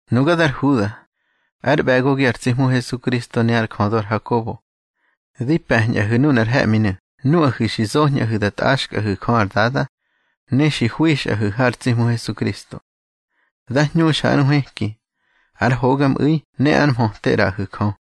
Nuga dar Huda, ár ꞌbe̱gogi ar tsi Hmu Hesukristo ne ár jödö ar Hakobo. Di pe̱ñꞌahu̱ nunar he̱ꞌminu̱ nuꞌahu̱ xi zoñꞌahu̱ da tꞌaxkꞌahu̱ Jö ar Dada, ne xi hwixꞌahu̱ har tsi Hmu Hesukristo. Dá hñuxa ár nhwëki, ár hogamꞌu̱i ne ar mhöte ꞌraꞌahu̱ Jö.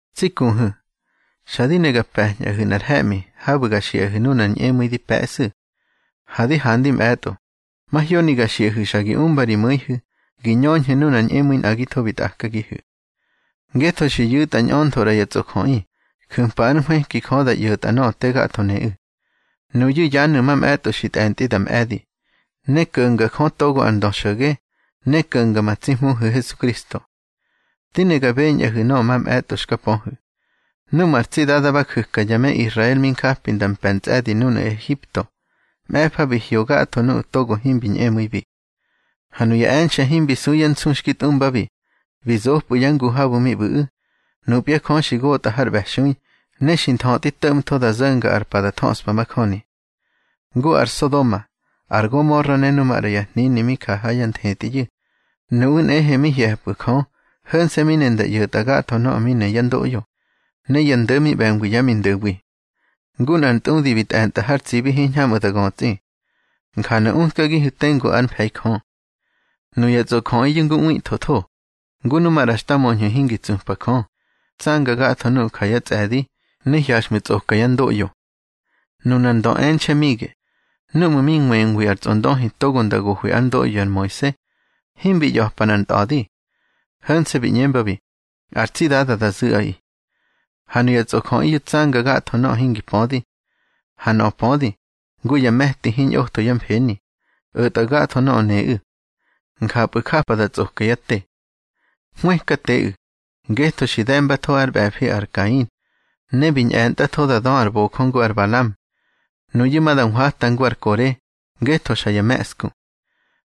Tsi kuhu̱, xa di ne ga pe̱ñꞌahu̱ nꞌar he̱ꞌmi habu̱ ga xiꞌahu̱ nunar ñꞌemu̱i di pe̱ꞌsu̱. Ha di handi mꞌe̱tꞌo, mahyoni ga xiꞌahu̱ xa gi umba ri mu̱ihu̱ gi ñöñhu̱ nunar ñꞌemu̱i nꞌagitho bi tꞌakagihu̱. Ngetho xi yu̱tꞌa ñꞌöntho ꞌra ya tsꞌojöꞌi ju̱mpa ár nhwëki Jö da ꞌyo̱tꞌa nöꞌö te gatho neꞌu̱. Nuyu̱ yanu̱ mamꞌe̱tꞌo xi tꞌe̱ntꞌi da mꞌe̱di, ne ko̱nga Jö togo ar ndö xo̱ge, ne ko̱nga ma tsi Hmuhu̱ Hesukristo. Di ne ga beñꞌahu̱ nöꞌö mamꞌe̱tꞌo xka pöhu̱: Núꞌmu̱ ar tsi Dada ba ju̱ka ya me Israel mi njapi nda mpe̱ ntsꞌe̱di núnu̱ Ehipto, mꞌe̱fa bi hyo gatho nuꞌu̱ togo himbi ñꞌemu̱ibi. Ha nuya e̱nxe̱ himbi su yá nsu xki tꞌumbabi, bi zopꞌu̱ yá ngu habu̱ mi ꞌbu̱ꞌu̱, nupya Jö xi gotꞌa har ꞌbe̱xui, ne xi nthötꞌi to̱ꞌmtho da zo̱nga ar pa da thöꞌspa majöni. Ngu ar Sodoma, ar Gomora ne nu maꞌra ya hnini mi ja ha yá nthetꞌiyu̱, nuꞌu̱ nꞌehe mi hye̱pꞌu̱ Jö, ho̱nse̱ mi ne nda ꞌyo̱tꞌa gatho nöꞌö mi ne yá ndoꞌyo, ne ya ndo̱ mi ꞌbe̱ngwi yá mindo̱wi. Ngu nꞌar ntꞌudi bi tꞌe̱ntꞌa har tsibi hiñhamꞌu̱ da götsꞌi. Njanu̱ utkagihu̱ tengu ár mfe̱i Jö. Nuya tsꞌojöꞌiyu̱ ngu ꞌwithötho, ngu nu maꞌra xta möñhu̱ hingi tsupa Jö, tsanga gatho nuꞌu̱ ja yá tsꞌe̱di, ne hyaxꞌmu̱ tsꞌoka yá ndoꞌyo. Nunar ndö e̱nxe̱ Mige, núꞌmu̱ mi nwengwi ar tsꞌondöhi togo nda gohwi ár ndoꞌyo ar Moise, himbi ꞌya̱pa nꞌar ntꞌa̱di. Ho̱nse̱ bi ꞌñembabi: Ar tsi Dada da zu̱ꞌaꞌi. Ha nuya tsꞌojöꞌiyu̱ tsanga gatho nöꞌö hingi pödi. Ha nöꞌö pödi, ngu ya me̱ti hiñꞌotho yá mfeni, o̱tꞌa gatho nöꞌö neꞌu̱. Njapꞌu̱ japa da tsꞌoka yá te. Hwëkateꞌu̱, ngetho xi de̱mbatho ár ꞌbe̱fi ar Kain, ne bi ñꞌe̱ntꞌatho da dö ar bojö ngu ar Balam. Nuyu̱ ma da nhwata ngu ar Kore, ngetho xa ya me̱ꞌsku.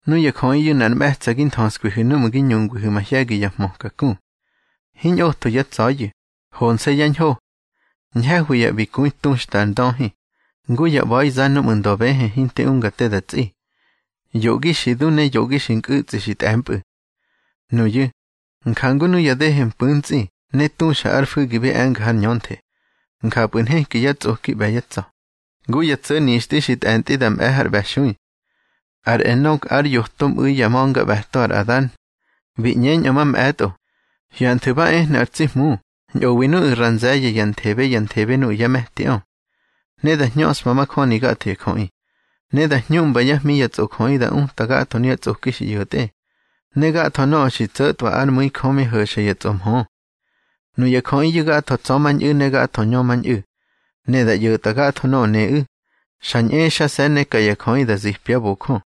Nuya jöꞌiyu̱ nꞌar mꞌe̱tsa̱ gi nthöskwihu̱ núꞌmu̱ gi ñungwihu̱ mahye̱gi ya hmöka ku. Hiñꞌotho yá tsa̱yu̱, honse̱ yá ñho. Ñhe̱hwi ya ꞌbikui tuxta ar ndöhi, ngu ya ꞌba̱iza núꞌmu̱ ndöbëhë hinti unga te da tsꞌi, yoꞌgi xi du ne yoꞌgi xi nkꞌu̱tsꞌi xi tꞌe̱mpꞌu̱. Nuyu̱, njangu nuya dehe mpu̱ntsꞌi ne tuxa ár fu̱gi bi e̱nga har ñönthe, njapꞌu̱ nheki yá tsꞌoki ꞌbe̱ yá tsa̱, ngu ya tso̱ nixtꞌi xi tꞌe̱ntꞌi da mꞌe̱ har ꞌbe̱xui. Ar Enok ár yoto mꞌu̱i yá ma̱ngaꞌbe̱to ar Adan, bi ꞌñeñꞌö mamꞌe̱tꞌo: Hyanthu̱ ba ehnu̱ ar tsi Hmu ñꞌowi nuꞌu̱ ra nze̱ye̱ ya nthebe ya nthebe nuꞌu̱ yá me̱tiꞌö. Ne da hñöꞌspa majöni gatho ya jöꞌi, ne da hñuꞌmba yá hmi ya tsꞌojöꞌi da uta gatho nuya tsꞌoki xi ꞌyo̱tꞌe, ne gatho nöꞌö xi tso̱tꞌwa ár mu̱i Jö mi ho̱xa ya tsꞌomhö. Nuya jöꞌiyu̱ gatho tsa̱mañꞌu̱ ne gatho ñömañꞌu̱, ne da ꞌyo̱tꞌa gatho nöꞌö neꞌu̱, xa ñꞌexase̱ ne ka ya jöꞌi da zipyá bojö.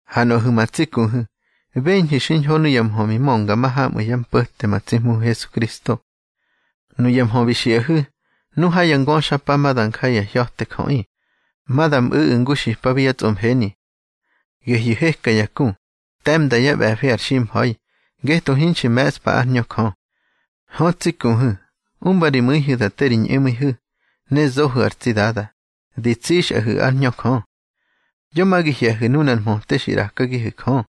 Ha nuꞌahu̱ ma tsi kuhu̱, beñhu̱ xiñho nuya mhö bi mönga mahamꞌu̱ yá mpo̱te ma tsi Hmuhu̱ Hesukristo. Nuya mhö bi xiꞌahu̱: Nu ha ya ngöxapa ma da nja ya hya̱te jöꞌi, ma da mꞌu̱ꞌu̱ ngu xipabi yá tsꞌomfeni. Gehyu̱ heka ya ku, te̱mnda yá ꞌbe̱fi ar ximha̱i, ngetho hinxi me̱ꞌspa ár Hñö Jö. Hö, tsi kuhu̱, umba ri mu̱ihu̱ da te ri ñꞌemu̱ihu̱, ne zohu̱ ar tsi Dada, di tsixꞌahu̱ ár Hñö Jö. Yo ma gi hye̱hu̱ nunar mhöte xi ꞌrakagihu̱ Jö,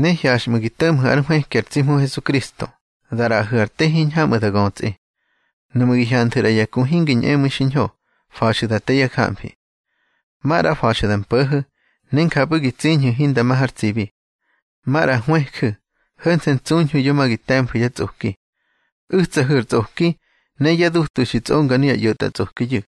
ne hyaxꞌmu̱ gi to̱ꞌmhu̱ ár nhwëki ma tsi Hmuhu̱ Hesukristo da ꞌraꞌahu̱ ar te hiñhamꞌu̱ da götsꞌi. Nuꞌmu̱ gi hyanthu̱ ꞌra ya ku hingi ñꞌemu̱i xiñho, fa̱xu̱ da te yá jamfi. Maꞌra fa̱xu̱ da mpo̱ho̱, ne njapꞌu̱ gi tsiñhu̱ hinda ma har tsibi. Maꞌra hwëju̱, ho̱nse̱ ntsuñhu̱ yo ma gi te̱mfu̱ yá tsꞌoki. U̱tsahu̱ ar tsꞌoki ne yá dutu xi tsꞌonga nuya ꞌyo̱tꞌatsꞌokiyu̱.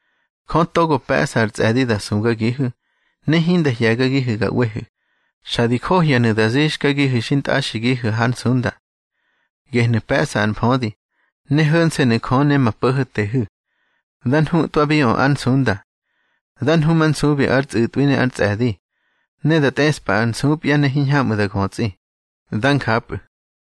Jö togo pe̱ꞌsa ar tsꞌe̱di da sugagihu̱, ne hinda hye̱gagihu̱ ga ꞌwehu̱, xa di johyanu̱ da zixkagihu̱ xintꞌaxigihu̱ hár nsunda. Gehnu̱ pe̱ꞌsa ar mfödi, ne ho̱nse̱nu̱ Jö ne ma Po̱ho̱tehu̱. Dá nhutꞌwabiꞌö ár nsunda. Dá nhumansubi ár tsꞌu̱tꞌwi ne ár tsꞌe̱di, ne da tꞌeꞌspa ár nsupya, ne hiñhamꞌu̱ da götsꞌi. Dá njapꞌu̱.